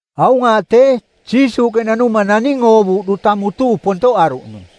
Aung aaꞌ tee, Jiisuuꞌke nanuma naning oovuuꞌ duta mutuu pontoꞌaruꞌnung.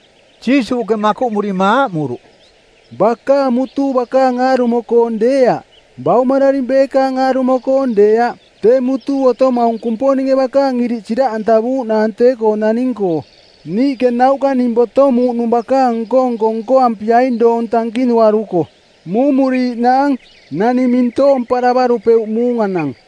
Jiisuuꞌke makuꞌmurima aaꞌmuruꞌ, “Bakaang mutuu bakaang aarumo-koong deeaꞌ; baumararing beekaang aarumo-koong deeaꞌ. Tee mutuu otomaung Kumponinge bakaang iriꞌ siraꞌantavuuꞌnaang tee-koo naning-koo. Niiꞌke nauꞌka ning botomuuꞌnung bakaang nko-nko nkoampiaing doong tankinuaruko. Muumuriiꞌnaang. Naning mintoomparavarupeuꞌ muunganang.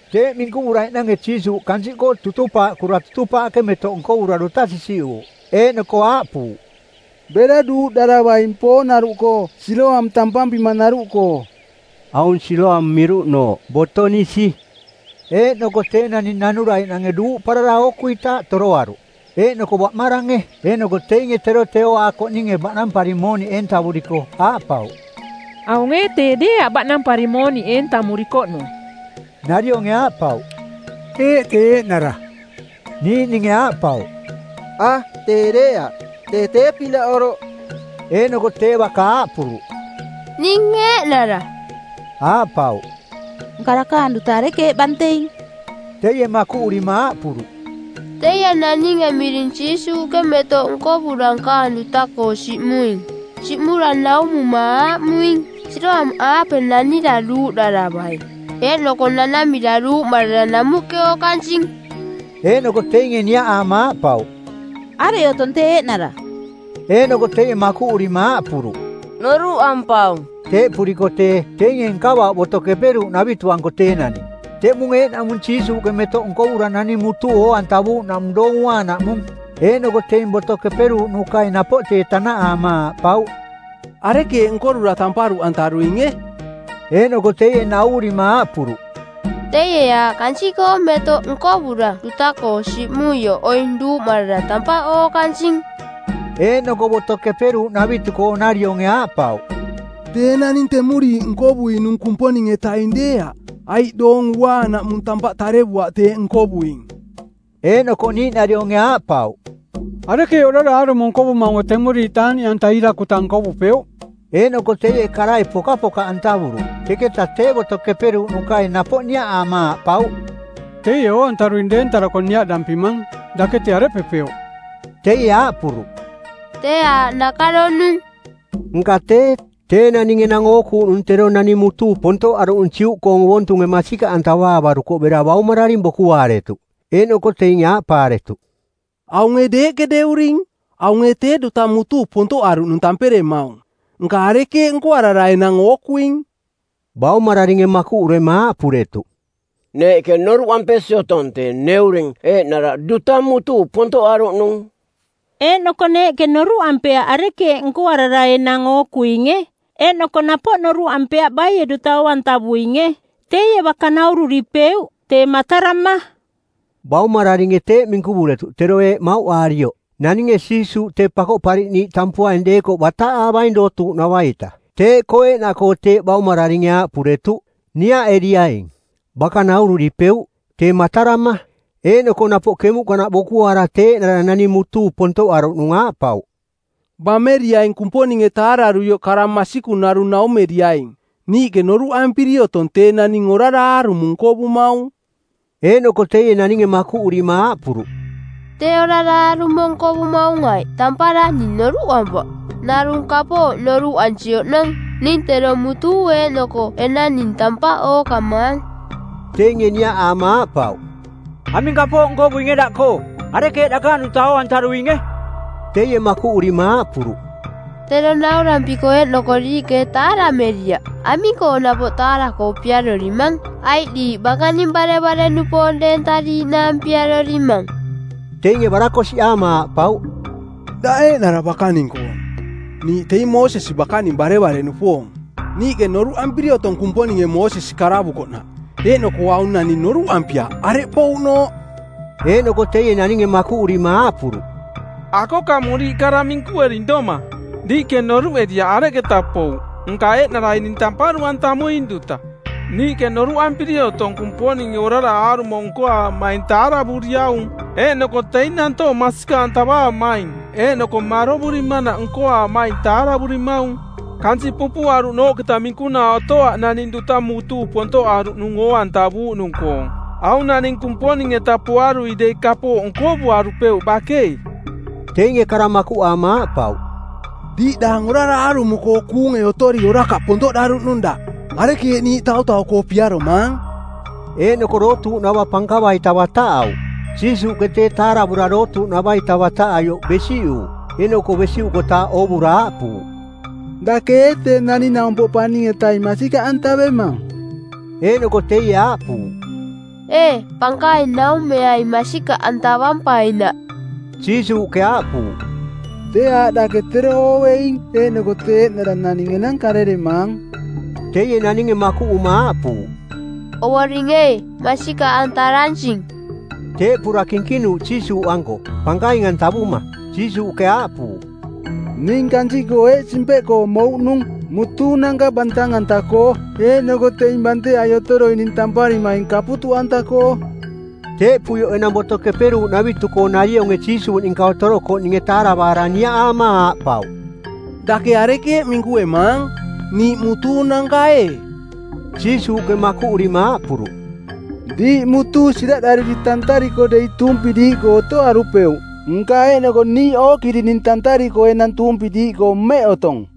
Teeꞌ minkuvuraiꞌnange Jiisuuꞌ kansiꞌkoo tutupaaꞌkura tutupaaꞌke metoꞌ nkovura duta sisiꞌuuꞌ, eeꞌnoko aaꞌpuuꞌ, “Bera duuꞌdaravaing poonaruꞌkoo Siloam tampampimanaruꞌkoo.” Aung Siloam miruꞌnooꞌ “Boto-nisi”. Eeꞌnoko tee naning nanuraiꞌnange duuꞌparara ookuitaaꞌ toroaruꞌ. Eeꞌnoko baꞌmarange eeꞌnoko teinge tero tee ooaakoꞌninge baꞌnampari mooniꞌ eentavuriko, aaꞌpauꞌ, “Aung ee tee deeaꞌ baꞌnampari mooniꞌ eentamurikoꞌnung?” Narionge aaꞌpauꞌ, “Eeꞌ, tee eeꞌnara.” Niiꞌninge aaꞌpauꞌ, “A, tee deeaꞌ. Tee tee-pinaꞌ oroꞌ.” Eeꞌnoko tee baka aaꞌpuruꞌ, “Ning eeꞌnara.” Aaꞌpauꞌ, “Nka dakaang duta arekeeꞌ banteing?” Teie makuꞌurima aaꞌpuruꞌ, “Teie naninge miring Jiisuuꞌke metoꞌ nkovura nkaang duta-koo siꞌmuing. Siꞌmura naumuma aaꞌmuing, ‘Siloam-aape nanira duuꞌdaravaing.’ Eeꞌnoko nanamira duuꞌmarara namuꞌke ookansing.” Eeꞌnoko teinge niaꞌaama aaꞌpauꞌ, “Areꞌ otong tee eeꞌnara?” Eeꞌnoko teie makuꞌurima aaꞌpuruꞌ, “Noruꞌampaung.” Teeꞌpuriko tee, teinge nkavauꞌ Boto Keperuuꞌnavitu-anko tee naning. Teꞌmung eeꞌnaꞌmung Jiisuuꞌke metoꞌ nkovura naning mutuu oo-antavuuꞌnaꞌmung Doong Uaanaꞌmung. Eeꞌnoko teing Boto Keperuuꞌnukai napoꞌ tee tanaꞌaama aaꞌpauꞌ, “Arekeeꞌ nkorura tamparuꞌantaruinge?” Eeꞌnoko teie nauvurima aaꞌpuruꞌ, “Teie aaꞌ kansiꞌkoong metoꞌ nkovura duta-koo siꞌmuioꞌ oing duuꞌmarara tampaꞌ ookansing.” Eeꞌnoko Boto Keperuuꞌnavitu-koonarioonge aaꞌpauꞌ, “Tee naning temuriiꞌ nkovuinung Kumponing-etaing deeaꞌ, aiꞌ Doong Uaanaꞌmung tampaꞌ tarevuaꞌ teeꞌ nkovuing.” Eeꞌnoko niiꞌnarionge aaꞌpauꞌ, “Arekeeꞌ orara aarumo nkovumaunge temuriiꞌ taaꞌniꞌanta iirakuta nkovupeuꞌ?” Eeꞌnoko teie karai pokapokaꞌantavuruꞌ. Teketa tee Boto Keperuuꞌnukai napoꞌ niaꞌaama aaꞌpauꞌ, “Teie oo-antaruing deentarako niaꞌdampimang: Dake tee areꞌpepeuꞌ?” Teie aaꞌpuruꞌ, “Tee aaꞌ nakaronung.” Nka tee, tee naning enang ookuuꞌnung tero naning mutuu pontoꞌaruꞌnung Juꞌkoong ovontunge masikaꞌantavaavarukoꞌ bera baumararing bokuaaretuꞌ. Eeꞌnoko teinge aaꞌpaaretuꞌ, “Aung ee deeꞌke deuring? Aung ee tee duta mutuu pontoꞌaruꞌnung tamperemaung? Nka arekeeꞌ nkoarara enang ookuing?” Baumararinge makuꞌurema aaꞌpuretuꞌ, “Neeꞌke noruꞌampesi otong tee neuring eeꞌnara duta mutuu pontoꞌaruꞌnung. Eeꞌnoko neeꞌke noruꞌampeaꞌ arekeeꞌ nkoarara enang ookuinge. Eeꞌnoko napoꞌ noruꞌampeaꞌ baie duta oo-antavuinge. Teie baka naururipeuꞌ, tee matarama.” Baumararinge teeꞌ minkuvuretuꞌ tero eeꞌ mauꞌaarioꞌ: Naninge Jiisuuꞌ tee Pakoꞌpariꞌniiꞌ tampuaing deekoꞌ bataꞌaavaing dootuuꞌnava-ita. Teeꞌkoo eeꞌnaꞌkoo teeꞌ baumararinge aaꞌpuretuꞌ, “Niaꞌeriaing, baka naururipeuꞌ, tee matarama.” Eeꞌnoko napoꞌ kemuꞌkanaꞌ bokuaara tee eeꞌnara naning mutuu pontoꞌaruꞌnung aaꞌpauꞌ, “Bameriaing Kumponinge taararuioꞌ kara masikung narung naumeriaing. Niiꞌke noruꞌampiri otong tee naning orara aarumo nkovumaung.” Eeꞌnoko teie naninge makuꞌurima aaꞌpuruꞌ, “Tee orara aarumo nkovumaung aiꞌ tampara, ning noruꞌampaꞌ. Narung kapooꞌ noruꞌansi oꞌnong, ning tero mutuu eeꞌnoko enang ning tampaꞌ ookamaang.” Teinge niaꞌaama aaꞌpauꞌ, “Aming kapooꞌ nkovuinge daꞌkoo? Arekeeꞌ dakaang duta oo-antaruinge?” Teie makuꞌurima aaꞌpuruꞌ, “Tero naurampiko eeꞌnoko diiꞌke ee taarameriaꞌ? Aming-koo napoꞌ taara-koo piarorimang? Aiꞌ diiꞌ bakaning barevare-nupoong deentariiꞌnaang piarorimang?” Teinge barakosiꞌaama aaꞌpauꞌ, “Daꞌ eeꞌnara bakaning-koong. Niiꞌ teing Moosesi bakaning barevare-nupoong. Niiꞌke noruꞌampiri otong Kumponinge Moosesi karavukoꞌnaꞌ, eeꞌnoko aung naning noruꞌampiaꞌ areꞌ pouꞌnooꞌ.” Eeꞌnoko teie naninge makuꞌurima aaꞌpuruꞌ, “Akokamuriiꞌ kara minkuering doma. Diiꞌke noruꞌeriaꞌ areketa pouꞌ, nka eeꞌnarai ning tamparuꞌantamuing duta. Niiꞌke noruꞌampiri otong Kumponinge orara aarumo nkoaamaing taaravuriaung, eeꞌnoko teing nantoong masikaꞌantavaamaing eeꞌnoko marovurimanaꞌ nkoaamaing taaravurimaung. Kansiꞌ pupuꞌaruꞌnooꞌketa minkunaa otoaꞌ naning duta mutuu pontoꞌaruꞌnung oo-antavuuꞌnung-koong. Aung naning Kumponing-eta poarui dei kapooꞌ nkovuarupeuꞌ bakei.” Teinge kara makuꞌaama aaꞌpauꞌ, “Diiꞌdaang orara aarumo-koo kuunge otori orakaꞌ pontoꞌdaruꞌnung daꞌ. Arekeeꞌ niiꞌ tautau-koo piaromaang?” Eeꞌnoko dootuuꞌnava pankava-ita bataꞌauꞌ. Jiisuuꞌke tee taaravura dootuuꞌnava-ita bataꞌaioꞌ besiꞌuuꞌ, eeꞌnoko besiꞌukotaaꞌ oovura aaꞌpuuꞌ, “Dake ee tee Naning-naumpoꞌ Paning-etaing masikaꞌantavemang?” Eeꞌnoko teie aaꞌpuuꞌ, “Ee pankaing, naumeaing masikaꞌantavampainaꞌ.” Jiisuuꞌke aaꞌpuuꞌ, “Tee aaꞌ dake tero ooveing eeꞌnoko tee eeꞌnara naning enang kareremaang.” Teie naninge makuꞌuma aaꞌpuuꞌ, “Ovoring ee, masikaꞌantaransing.” Teeꞌpura kinkinuuꞌ Jiisuuꞌanko, pankaing-antavuma. Jiisuuꞌke aaꞌpuuꞌ, “Ning kansiꞌkoo eeꞌ simpeꞌkoo mouꞌnung: mutuunanka bantang-anta-koo eeꞌnoko teing banteai otoroining tamparimaing kaputuꞌanta-koo.” Teeꞌpuioꞌ enang Boto Keperuuꞌnavitu-koo-narionge Jiisuuꞌ ninka otorokoꞌninge taaravaara niaꞌaama aaꞌpauꞌ, “Dake arekeeꞌ minkuemaang? Niiꞌ mutuunanka ee?” Jiisuuꞌke makuꞌurima aaꞌpuruꞌ, “Diiꞌ mutuu siraꞌrariri tantariko dei tuumpi diiꞌkoo otoarupeuꞌ. Nka eeꞌnoko ‘Niiꞌ ookirining!’ tantariko enang tuumpi diiꞌkoo mmeꞌ otong.”